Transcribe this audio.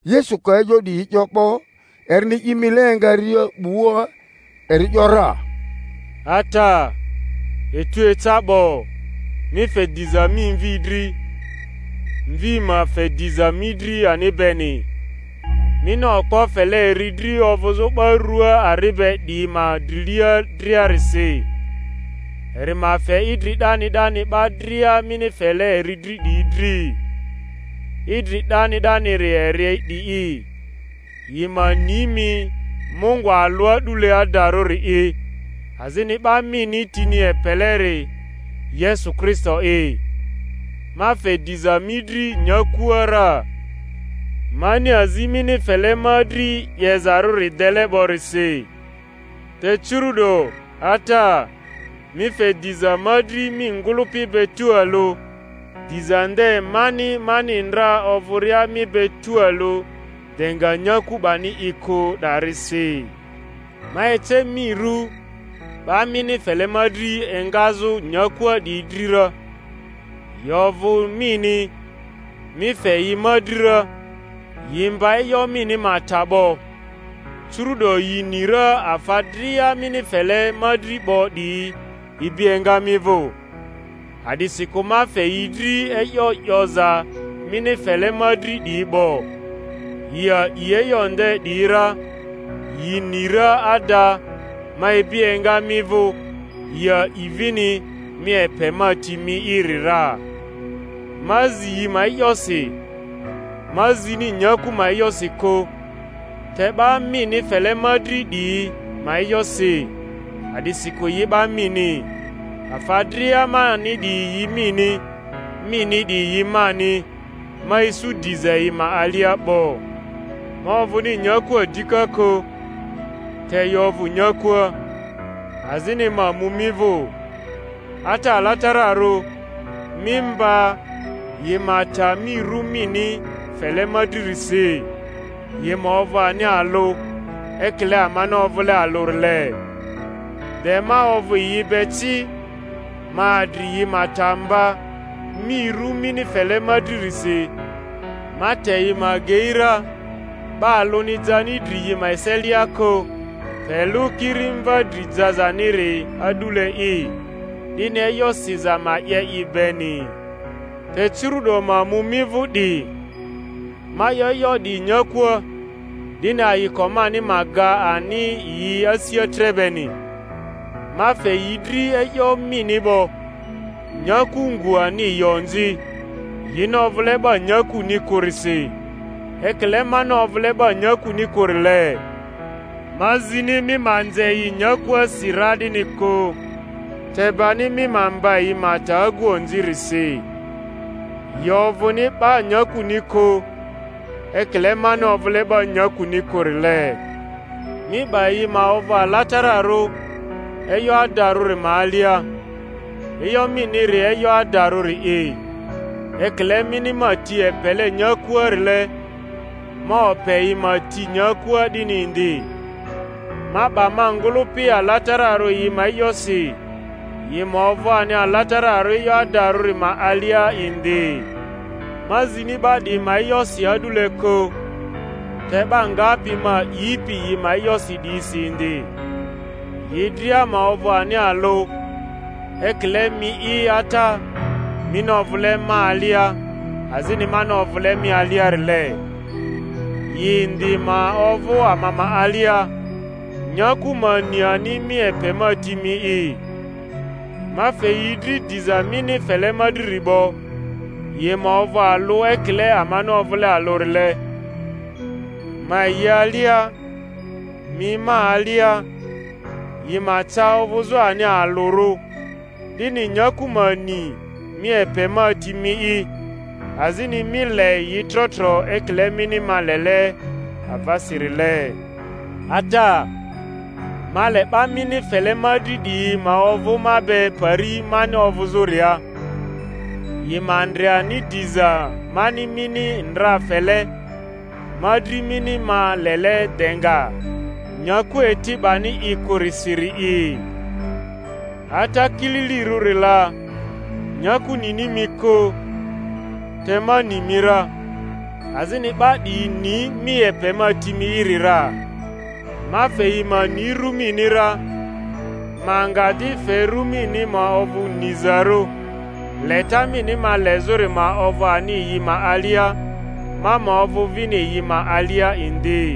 Yesu ka e'yo 'diyi 'yo 'bo, erini i mile engaria 'bua eri ‘yora, Ata, etu eca 'bo; mi fe diza mi Mvi dri, Mvi ma fe diza mi dri ani beni, mini okpo fele eri dri ovᴜzᴜ 'ba rua ari be 'diyi ma drilia driarisi, eri ma fe idri 'dani 'dani 'ba dria mini fele eri dri 'diyi dri. Idri 'dani 'daniri eri 'di'i, yi ma ni mi Mungᴜ alᴜ a'dule adarᴜri'i, azini 'ba mini tini epeleri Yesu Kristo'i. Ma fe diza mi dri nyakua ra, mani azi mini fele ma dri 'yezarᴜri dele 'borisi; te curu'do, Ata, mi fe diza ma dri mi ngᴜlᴜpi be tualᴜ, diza nde mani mani ndra ovᴜria mi be tualᴜ de nga nyaku 'bani i kᴜ 'darisi. Ma ece mi ru 'ba mini fele ma dri engazᴜ nyakua 'diyi dri ra; yi ovᴜ mini, mi fe yi ma dri ra, yi mba e'yo mini ma ta 'bo. Curu'do yi ni ra afa dria mini fele ma dri 'bo 'diyi ibi enga mi vᴜ; a'disikᴜ ma fe yi dri e'yo 'yoza mini fele ma dri 'diyi 'bo, yi a'i e'yo nde 'diyi ra, yi ni ra ada ma ibi enga mi vᴜ; yi a'i vini mi epe ma ti mi'iri ra. Ma zi yi ma e'yosi; ma zini nyaku ma e'yosi kᴜ, te 'ba mini fele ma dri 'diyi ma e'yosi, a'disikᴜ yi 'ba mini; afa dria mani 'diyi yi mini, mini 'diyi yi mani, ma isu diza yi ma alia 'bo. Ma ovᴜmi nyakua dika kᴜ, te yi ovᴜ nyakua, azini ma mu mi vᴜ. Ata Alatararᴜ, mi mba, yi ma ta mi rᴜ mini fele ma dririsi, yi ma ovᴜ ani alᴜ, ekile amani ovᴜle alᴜrile. De ma ovᴜ yi be ci, ma adri yi ma ta mba mi ru mini fele ma dririsi; ma te yi ma agei ra, 'ba alᴜni jani dri yi ma eselia kᴜ, pe lᴜ kiri mva dri jazaniri a'dule'i, 'dini e'yo siza ma 'ye i beni. Te curu'do ma mu mi vᴜ 'di; ma 'yo e'yo 'diyi nyakua, 'dini ayiko mani ma ga ani yi asia tre beni. Ma fe yi dri e'yo mini 'bo; nyaku ngᴜ ani yi onzi, yini ovᴜle 'ba nyakuni kᴜrisi, ekile mani ovᴜle 'ba nyakuni kᴜrile. Ma zini mi ma nze yi nyakuasi ra 'dini kᴜ, te bani mi ma mba yi ma ta agu onzirisi. Yi ovᴜni 'ba nyakuni kᴜ, ekile mani ovᴜle 'ba nyakuni kᴜrile. Mi 'ba yi ma ovᴜ alatararᴜ e'yo adarᴜri ma alia; e'yo miniri e'yo adarᴜri'i. Ekile mini ma ti epele nyakua-rile, ma ope yi ma ti nyakua 'dini indi. Ma 'ba ma ngᴜlᴜpi ala-tararᴜ yi ma e'yosi, yi ma ovᴜ ani alatararᴜ e'yo adarᴜri ma alia indi. Ma zini 'ba 'diyi ma e'yosi a'dule kᴜ, te 'ba ngapi ma a'ipi yi ma e'yosi 'diyisi indi, yi dria ma ovᴜ ani alᴜ; ekile mi'i Ata, mini ovᴜle ma alia, azini mani ovᴜle mi aliarile, yi indi ma ovᴜ ama ma alia, nyaku ma ni ani mi epe ma ti mi'i. Ma fe yi dri diza mini fele ma driri 'bo, yi ma ovᴜ alᴜ ekile amani ovᴜle alᴜrile; ma yi alia, mi ma alia, yi ma ca ovᴜzᴜ ani alᴜrᴜ, 'dini nyaku ma ni mi epe ma ti mi'i, azini mi le yi trotro ekile mini ma lele avasirile. Ata, ma le 'ba mini fele ma dri 'diyi ma ovᴜ ma be pari mani ovᴜzᴜria, yi ma ndre ani diza mani mini ndra fele ma dri mini ma lele de nga nyaku eti 'bani i kᴜrisiri'i. Ata kili-lirᴜri la, nyaku nini mi kᴜ, te ma ni mi ra; azini 'ba 'diyi ni mi epe ma ti mi'iri ra. Ma fe yi ma ni ru mini ra, ma nga di fe ru mini ma ovᴜ nizarᴜ, leta mini ma lezᴜri ma ovᴜ ani yi ma alia, ma ma ovᴜ vini yi ma alia indi.